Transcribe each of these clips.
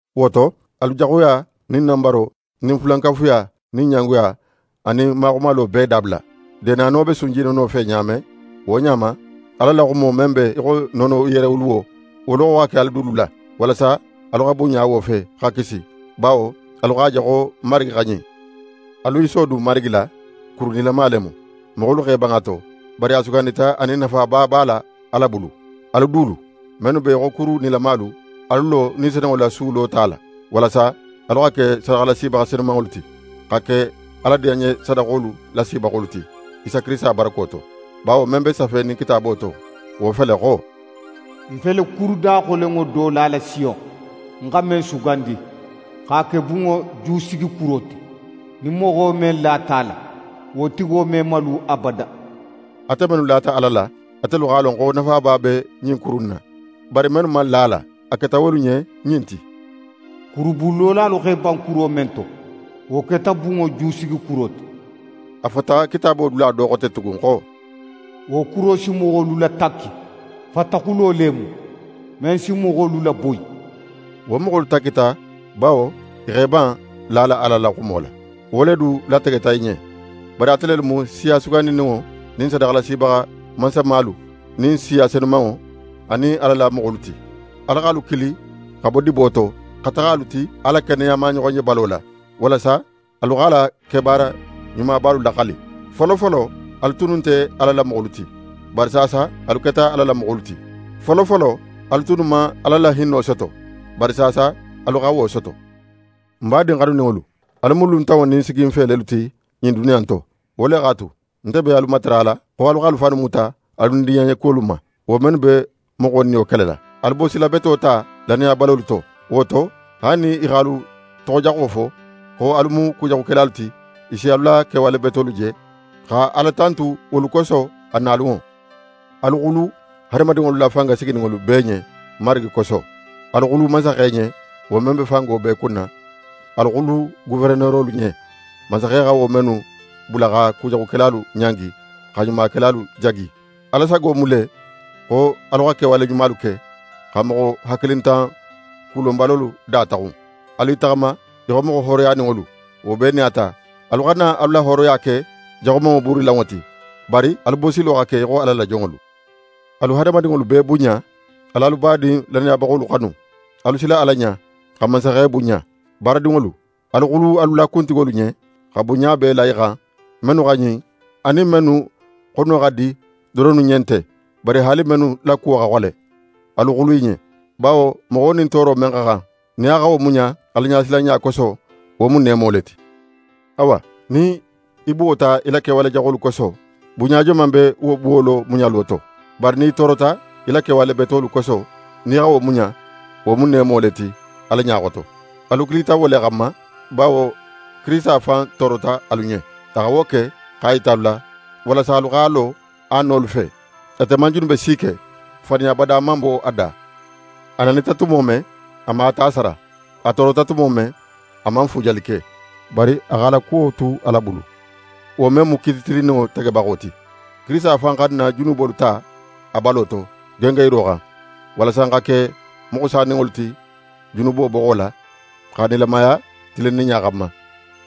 Wo to, alu jaxuya nin nanbaro nin fulankafuya nin ɲangoya anin maxumalo bee dabula. Deenano be sunjinono fe ɲa men, wo ɲa ma, Ala la xumo men be í xo nono yerewuluwo, wo loxo xa ke alu dulu la, walasa alu xa bunɲa wo fe, xa kisi; bawo alu x'a je xo Marigi xa ɲin. Alu i sodun Marigi la, kuru nilama le mu. Moxolu x'e ban a to, bari a sugandita anin nafaba b'a la Ala bulu. Alu dulu, mennu be í xo kuru nilamalu, alu lo Ni Senunŋo la Su lota la, walasa alu xa ke sadaxalasibaxa senumanŋolu ti, xa ke Ala diyanɲesadaxolu lasibaxolu ti, Isa Kirisita barako to. Bawo men be safenin Kitaabo to, wo fele xo: «Ń fele kuru daxolenŋo do lala Siyon, ń xa men sugandi, x'a ke bunŋo jusigikuro ti; nin moxo men lata a la, wo tigo me malu abada.» Ate mennu lata Ala la, atelu x'a lon xo nafaba be ɲin kuru in na, bari mennu man la a la, a keta wolu ɲen ɲin ti: «Kurubunlolalu x'e ban kuro men to, wo keta bunŋo jusigikuro ti.» A fota Kitaabo dula do xote tugun xo: «Wo kuro si moxolu latakki, fataxulo le mu, men si moxolu laboyi.» Wo moxolu takkita bawo i x'e ban lala Ala la xumo la. Wo le du lategeta i ɲen. Bari ate lelu mu siya sugandininŋo nin sadaxalasibaxa mansamalu nin siya senumanŋo anin Ala la moxolu ti. Ala x'alu kili xa bo dibo to, xa taxa alu ti a la keneya maɲoxonjebalo la, walasa alu x'a la kebaara ɲumabalu laxali. Folofolo, alu tunnu nte Ala la moxolu ti, bari saasa alu keta Ala la moxolu ti. Folofolo, alu tunnu man Ala la hinno soto, bari saasa, alu xa wo soto. N badin xanuninŋolu, alu mu luntanŋo nin siginfe lelu ti ɲin duniya in to. Wo le x'a tu, nte be alu matarala xo alu xa alu fannu muta alu nidiyanɲekuwolu ma, wo mennu be moxo niyo kelela. Alu bosila beto ta lannayabalolu to. Wo to, haali nin i x'alu toxojaxo fo, xo alu mu kujaxukelalu ti, i si alu la kewale betolu je, xa Ala tantu wolu koso, a nalunŋo. Alu xulu hadamadinŋolu la fanga sigininŋolu bee ɲen, Marigi koso. Alu xulu mansaxe ɲen, wo men be fango bee kunna. Alu xulu goferenerolu ɲen, mansaxe xa wo mennu bula xa kujaxukelalu ɲangi, xa ɲumakelalu jagi. Ala sago mu le, xo alu xa kewale ɲumalu ke, xa moxo hakilintan kulonbalolu da taxun. Alu i taxama í xo moxo hooroyaninŋolu, wo bee nin a ta, alu xana alu la hooroya ke jaxumanŋo buurilanŋo ti, bari alu bosilo xa ke í xo Ala la jonŋolu. Alu hadamadinŋolu bee bunɲa, al'alu badin lannayabaxolu xanu. Alu sila Ala ɲa, xa mansaxe bunɲa. Baaradinŋolu, alu xulu alu la kuntigolu ɲen, xa bunɲa bee la i xan, mennu xa ɲin anin mennu xono xa di doronnu ɲen nte, bari haali mennu la kuwo xa xole, alu xulu i ɲen. Bawo moxo nin tooro men man xan, nin a xa wo muɲa Alaɲasilanɲa koso, wo mu neemo le ti. Awa, nin í buwota í la kewale jaxolu koso, bunɲa joman be wo buwolo muɲalo to? Bari nin í toorota í la kewale betolu koso, nin í xa wo muɲa, wo mu neemo le ti Ala ɲa xoto. Alu kilita wo le xanma, bawo Kirisita fan toorota alu ɲen. A xa wo ke x'a yita alu la, walasa alu x'a lo a nolu fe. Ate man junube si ke, faniya bada man bo a da. A nanita tumo men, a man a ta sara. A toorota tumo men, a man fuujali ke, bari a x'a la kuwo tu Ala bulu, wo men mu kiiti tilinninŋo tegebaxo ti. Kirisita fan xa n na junubolu ta a balo to, gengenyiro xan, walasa n xa ke moxo saninŋolu ti junubo boxo la, xa nilamaya tilinninɲa xanma.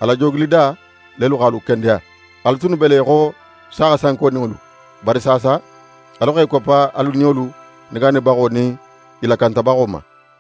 A la joogilida lelu x'alu kendeya. Alu tunnu be le í xo saaxa sankoninŋolu, bari saasa, alu x'e koppa alu niyolu negaanibaxo nin i lakantabaxo ma.